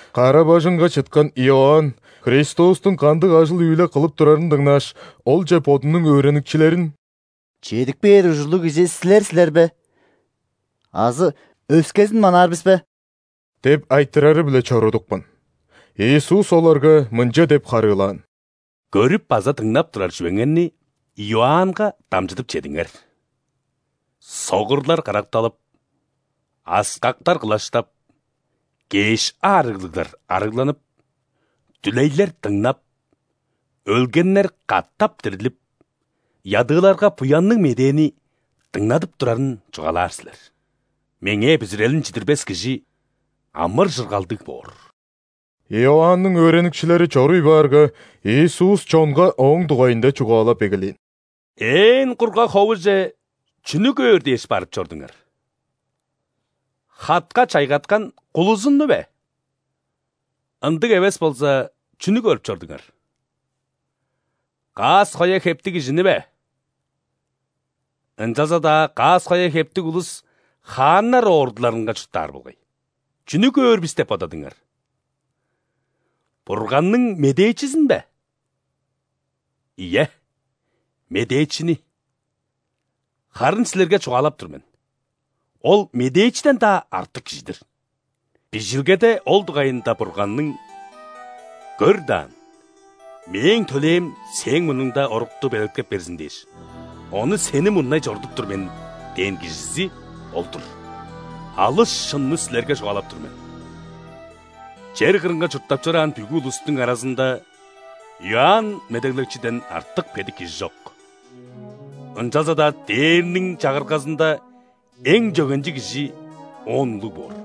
Кара-бажыңга чыткан Иоанн Христостуң кандыг ажыл-үүле кылып турарын дыңнааш, Олче бодунуң өөреникчилерин: «Чедип кээр ужурлуг Кижи Силер силер бе азы өскезин манаар бис бе?» – деп айтырары-биле чорудупкан. Иисус оларга мынча деп харыылаан: «Көрүп база дыңнап турар чүвеңерни Иоаннга дамчыдып чедиңер: согурлар каракталып, аскактар кылаштап, кеш аарыглыглар арыгланып, дүлейлер дыңнап, өлгеннер катап дирлип, ядыыларга Буянныг Медээни дыңнадып турарын чугаалаар силер. Меңээ бүзүрелин чидирбес кижи амыр-чыргалдыг боор». Иоанның өөреникчилери чоруй баарга, Иисус чонга ооң дугайында чугаалап эгелээн: «Ээн кургаг ховуже чүнү көөр дээш барып чордуңар? Хатка чайгаткан кулузунну бе? Ындыг эвес болза, чүнү көрүп чордуңар? Каас-коя хептиг кижини бе? Ынчалза-даа каас-коя хептиг улус хааннар ордуларынга чурттаар болгай. Чүнү көөр бис деп бодадыңар? Бурганның медээчизин бе? Ийе, медээчини. Харын силерге чугаалап тур мен: ол – медээчиден-даа артык кижи-дир. Бижилгеде ол дугайында Бурганның: „Көр даан, Мээң төлээм Сээң мурнуңда орукту белеткеп берзин дээш, ону Сени мурнай чорудуп тур мен“ – дээн кижизи ол-дур. Алыс шынны силерге чугаалап тур мен: чер кырынга чурттап чораан бүгү улустуң аразында Иоанн Медеглекчиден артык бедик кижи чок. Ынчалза-даа Дээрниң Чагыргазында эң чөгенчиг кижи оон улуг боор.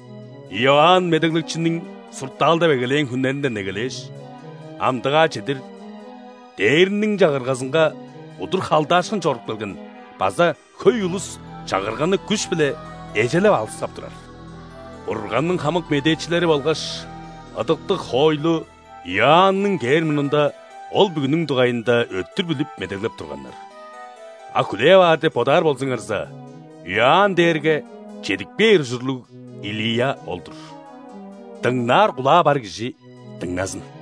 Иоанн Медеглекчиниң суртаалдап эгелээн хүннеринден эгелээш, амдыгаа чедир Дээрниң Чагыргазынга удур халдаашкын чоруп келген база хөй улус Чагырганы күш-биле эжелеп алыксап турар. Бурганның хамык медээчилери болгаш ыдыктыг хоойлу Иоанның кээр мурнунда ол бүгүнүң дугайында өттүр билип медеглеп турганнар. А хүлээп аар деп бодаар болзуңарза, Иоанн дээрге чедип кээр ужурлуг Илия ол-дур. Дыңнаар кулаа бар кижи дыңназын!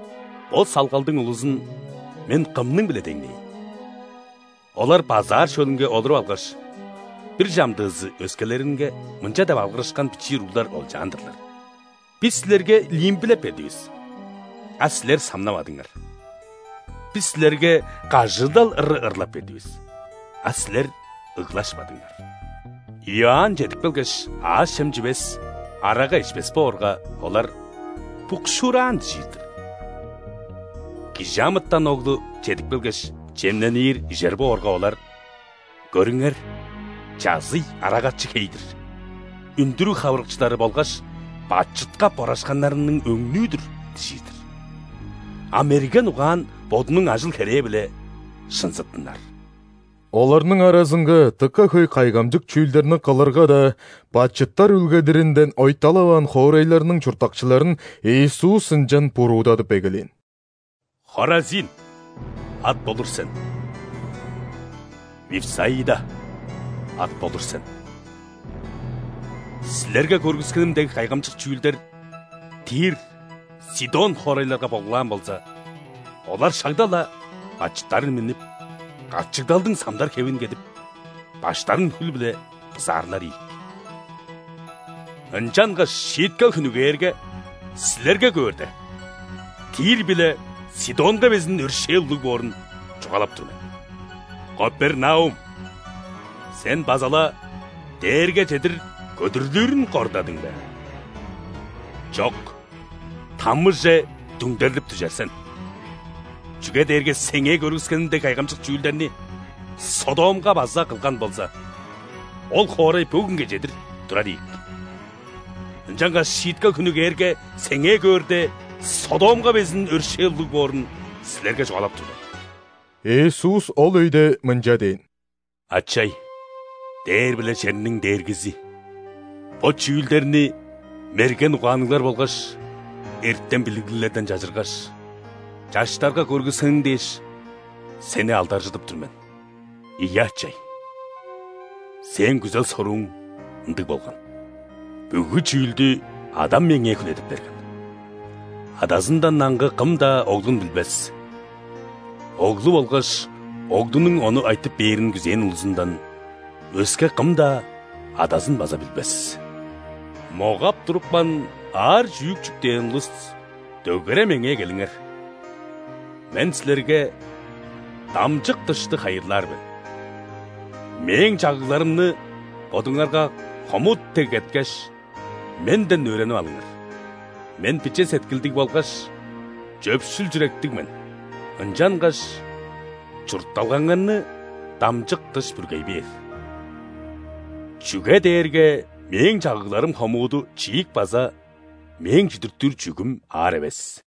Бо салгалдың улузун Мен кымның-биле деңнээйн? Олар базаар шөлүнге олуруп алгаш, бир чамдыызы өскелеринге мынча деп алгырышкан бичии уруглар олчаан-дырлар: „Бис силерге лимбилеп бердивис,а силер самнавадыңар.Бис силерге кажыыдал ыры ырлап бердивис,а силер ыглашпадыңар“. Иоанн чедип келгеш, аъш-чем чивес, арага ишпес боорга, олар: „Букшуураан“ – дижир-дир. ·Кижи амытан Оглу чедип келгеш, чемненир, ижер боорга, олар: „Көрүңер, чазый, арагачы хей-дир, үндүрүг хавырыкчылары болгаш бачытка борашканнарның өңнүү-дүр“ – дижир-дир. А мерген угаан бодунуң ажыл-херээ-биле шынзыттынар». Оларның аразынга дыка хөй кайгамчык чүүлдерни кылырга-даа, бачыттар үүлгедиринден ойталаваан хоорайларның чурттакчыларын Иисус ынчан буруудадып эгелээн: «Хоразин, ат болур сен! Вифсаида, ат болур сен! Силерге көргүскеним дег кайгамчык чүүлдер Тир, Сидон хоорайларга болгулаан болза, олар шагда-ла бачыттарын миннип, качыгдалдың самдар хевин кедип, баштарын хүл-биле бызаарлар ийик. Ынчангаш шииткел хүнү кээрге, силерге көөрде, Тир биле Сидонга безин өршээл улуг боорун чугаалап тур мен. Капернаум, сен база-ла дээрге чедир көдүрлүрүн кордадың бе? Чок, ·тамыже дүңдерлип дүжер сен! Чүге дээрге сеңээ көргүскеним дег кайгамчык чүүлдерни Содомга база кылган болза, ол хоорай бөгүнге чедир турар ийик. Ынчангаш шииткел хүнү кээрге, сеңээ көөрде, Содомга безин өршээл улуг боорун силерге чугаалап тур мен!» Иисус ол өйде мынча дээн: «Ачай, дээр биле черниң Дээргизи! Бо чүүлдерни мерген угаанныглар болгаш эртем-билиглиглерден чажыргаш, чаштарга көргүскениң дээш, Сени алдаржыдып тур мен! Ийе, Ачай, Сээң күзел-сорууң ындыг болган. Бүгү чүүлдү Адам Меңээ хүлээдип берген. Адазындан аңгы кым-даа Оглун билбес, Оглу болгаш Оглунуң ону айтып бээрин күзээн улузундан өске кым-даа Адазын база билбес». «Могап турупкан, аар чүък чүктээн улус дөгере Меңээ келиңер! Мен силерге тамчык-дышты хайырлаар мен. Мээң чагыгларымны бодуңарга хомут дег кеткеш, Менден өөренип алыңар, Мен биче сеткилдиг болгаш чөпшүл чүректиг мен, ынчангаш чуртталгаңарны тамчык-дыш бүргей бээр. Чүге дээрге Мээң чагыгларым хомуду чиик база Мээң чүдүртүр чүъгүм аар эвес».